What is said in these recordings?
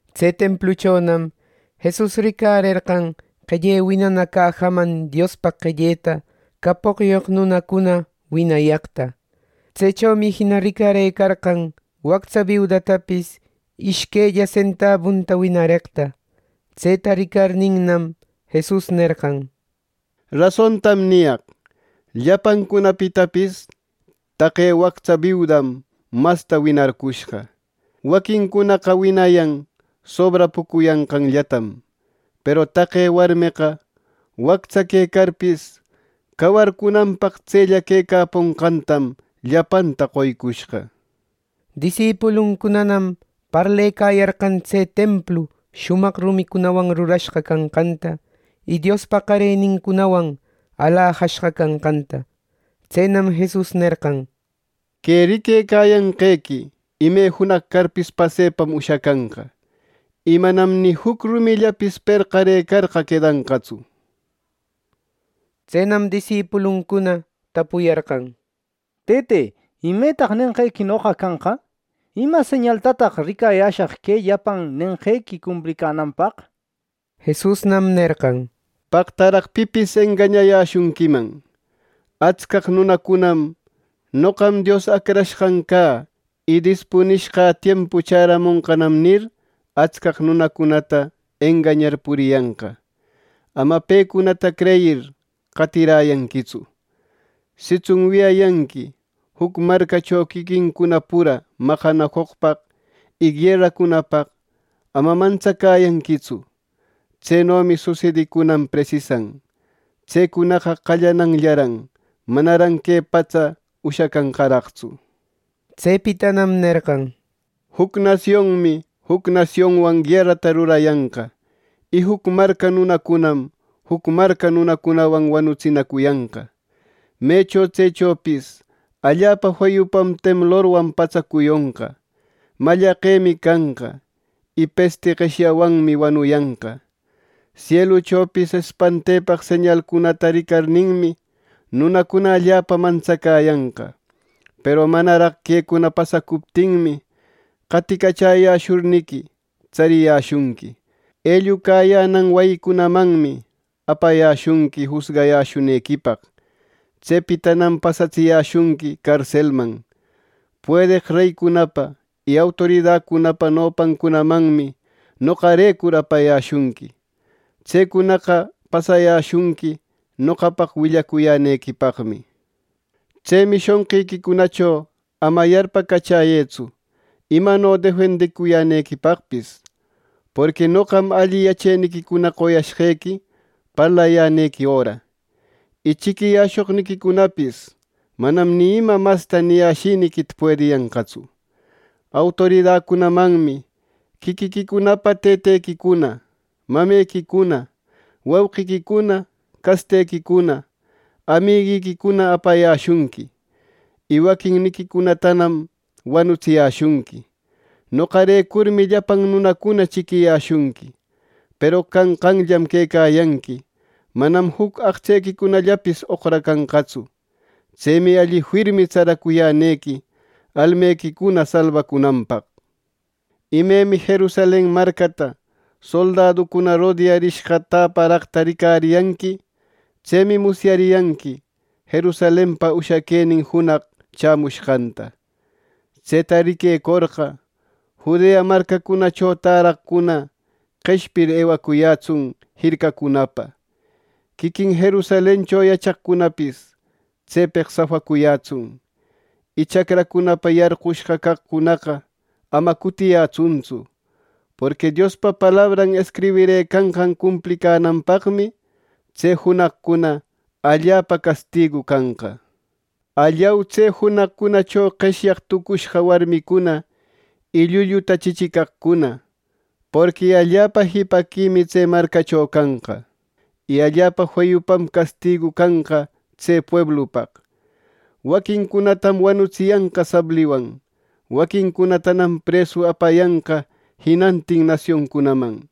Tse templuchonam Jesus ricarerqan qelle winana cajaman Diospaq qelleta capoqyoq nunacuna winayaqta. Tsechomi jina ricarerqan wactsa biudatapis ishquella sentabunta winareqta. Tseta ricarninnam, Jesus nerqan: —Rasontam niyaq: Llapancunapitapis taqe wactsa biudam masta winarcushqa. Waquincunaqa winayan sobrapucuyanqanllatam; peru taqe warmeqa wactsa quecarpis cawarcunanpaq tsella quecaponqantam llapanta qoycushqa. Disipuluncunanam parlecayarqan tse templu shumaq rumicunawan rurashqa canqanta, y Diospa qarenincunawan alajashqa canqanta. Tsenam Jesus nerqan: —Que riquecayanqequi ime junaq carpis pasepam ushacanqa, y manam ni juc rumillapis perqarëcarqa quedanqatsu. Tsenam disipuluncuna tapuyarqan: —Tëte, ¿imetaq nenqequinoqa canqa? ¿Ima señaltataq ricayäshaq que llapan nenqequi cumplicänanpaq? —nir. Jesusnam nerqan: —¡Paqtaraq pipis engañayäshunquiman! Atscaq nunacunam ‘¡Noqam Dios Acrashqan cä!’ y ‘¡Dispunishqa tiempu chämonqanam!’ nir, atscaq nunacunata engañar puriyanqa. Ama pecunata creyir, qatiräyanquitsu. Sitsun wiyayanqui juc marcacho quiquincuna pura maqanacoqpaq y gueracunapaq, ama mantsacäyanquitsu. Tsenomi susedicunan presisan. Tsecunaqa qallananllaran; manaran que patsa ushacanqaraqtsu. Tsepitanam nerqan: —Juc nasionmi juc nasionwan guerata rurayanqa. Y juc marca nunacunam juc marca nunacunawan wanutsinacuyanqa. Mecho tsechopis allapa feyupam temblorwan patsa cuyonqa; mallaqemi canqa; y pesti qeshyawanmi wanuyanqa. Sieluchopis espantepaq señalcunata ricarninmi, nunacuna allapa mantsacäyanqa. “Peru manaraq quecuna pasacuptinmi, qatïcachäyäshurniqui tsariyäshunqui. Ellucayänan wayicunamanmi apayäshunqui jusgayäshunequipaq. Tsepitanam pasatsiyäshunqui carselman. Puedeq reycunapa y autoridacunapa nopancunamanmi noqarecur apayäshunqui. Tsecunaqa pasayäshunqui noqapaq willacuyänequipaqmi. Tsemi shonqiquicunacho ama yarpacachäyëtsu imano defendicuyänequipaqpis. Porqui noqam alli yacheniquicuna qoyashqequi parlayänequi öra. Y chiquiyäshoqniquicunapis manam ni ima masta niyäshiniquita puediyanqatsu. Autoridacunamanmi quiquiquicunapa tëtequicuna, mamequicuna, wauqiquicuna, castequicuna, amiguiquicuna apayäshunqui; y waquinniquicunatanam wanutsiyäshunqui. Noqarecurmi llapan nunacuna chiquiyäshunqui. Peru canqanllam quecayanqui, manam juc aqtsequicunallapis oqracanqatsu. Tsemi alli firmi tsaracuyänequi almequicuna salbacunanpaq. “Imemi Jerusalen marcata soldaducuna rodearishqa täparaqta ricariyanqui, tsemi musyariyanqui Jerusalenpa ushaquenin junaq chämushqanta. Tseta riquecorqa, Judea marcacunacho täraqcuna qeshpir, ewacuyätsun jircacunapa. Quiquin Jerusalencho yachaqcunapis tsepeq safacuyätsun, y chacracunapa yarqushqa caqcunaqa ama cutiyätsuntsu. Porqui Diospa palabran escribirëcanqan cumplicänanpaqmi, tse junaqcuna allapa castigu canqa. ¡Allau, tse junaqcunacho qeshyaq tucushqa warmicuna y llulluta chichicaqcuna! Porqui allapa jipaquimi tse marcacho canqa, y allapa feyupam castigu canqa tse pueblupaq. Waquincunatam wanutsiyanqa sabliwan; waquincunatanam presu apayanqa jinantin nasioncunaman.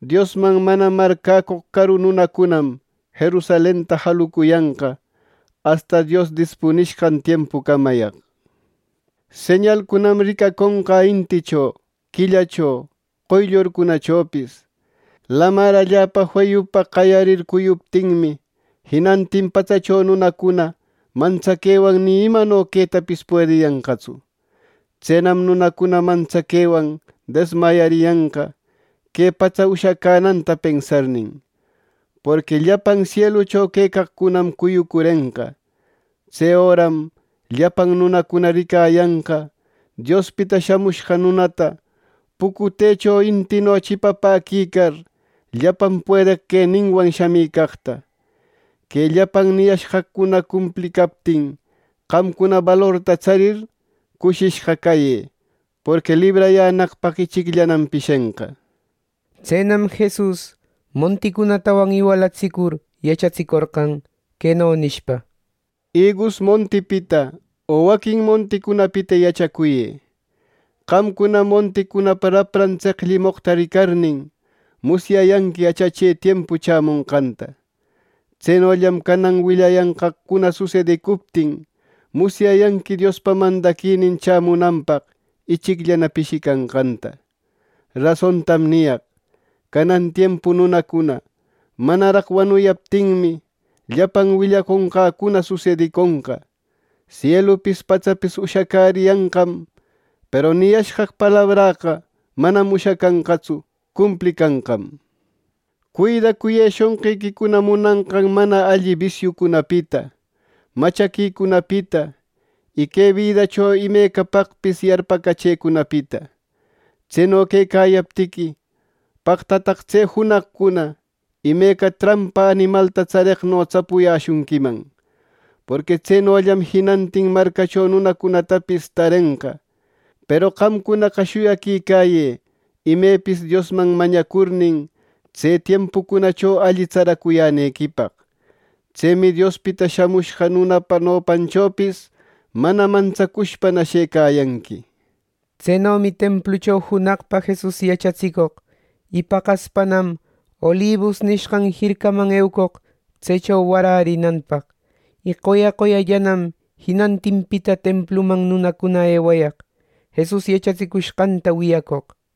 Diosman mana marcäcoq caru nunacunam Jerusalenta jalucuyanqa, asta Dios dispunishqan tiempucamayaq. “Señalcunam ricaconqa inticho, quillacho, qoyllurcunachopis. Lamar allapa feyupa qayarir cuyuptinmi, jinantin patsacho nunacuna mantsaquewan ni imano quetapis puediyanqatsu. Tsenam nunacuna mantsaquewan desmayariyanqa que patsa ushacänanta pensarnin; porqui llapan sielucho quecaqcunam cuyucurenqa. Tse öram llapan nunacuna ricayanqa Diospita Shamushqa Nunata pucutecho intino chipapäquicar, llapan puedeq queninwan shamicaqta. Que llapan niyashqaqcuna cumplicaptin, qamcuna balorta tsarir, cushishqa cayë; porqui librayänaqpaq ichicllanam pishenqa.” Tsenam Jesus monticunatawan iwalatsicur yachatsicorqan, queno nishpa: “Igus montipita o waquin monticunapita yachacuyë. Qamcunam monticunapa rapran tseqllimoqta ricarnin, musyayanqui achache tiempu chämonqanta. Tsenollam canan willayanqaqcuna susedicuptin, musyayanqui Diospa mandaquinin chämunanpaq ichicllana pishicanqanta. “Rasontam niyaq: Canan tiempu nunacuna manaraq wanuyaptinmi, llapan willaconqäcuna susediconqa. Sielupis patsapis ushacäriyanqam, peru niyashqaq palabräqa manam ushacanqatsu; cumplicanqam. “Cuidacuyë shonqiquicuna munanqan mana alli bisiucunapita, machaquicunapita, y que bidacho imecapaqpis yarpacachecunapita. Tseno quecayaptiqui, paqtataq tse junaqcuna imeca trampa animalta tsareqno tsapuyäshunquiman. Porqui tsenollam jinantin marcacho nunacunatapis tarenqa. Peru qamcunaqa shuyaquïcäyë imepis Diosman mañacurnin, tse tiempucunacho alli tsaracuyänequipaq. Tsemi Diospita Shamushqa Nunapa nopanchopis mana mantsacushpana shëcäyanqui.” Tsenomi templucho junaqpa Jesus yachatsicoq, y paqaspanam Olibus nishqan jircaman eucoq tsecho warärinanpaq. Y qoya qoyallanam jinantinpita templuman nunacuna ewayaq, Jesus yachatsicushqanta wiyacoq.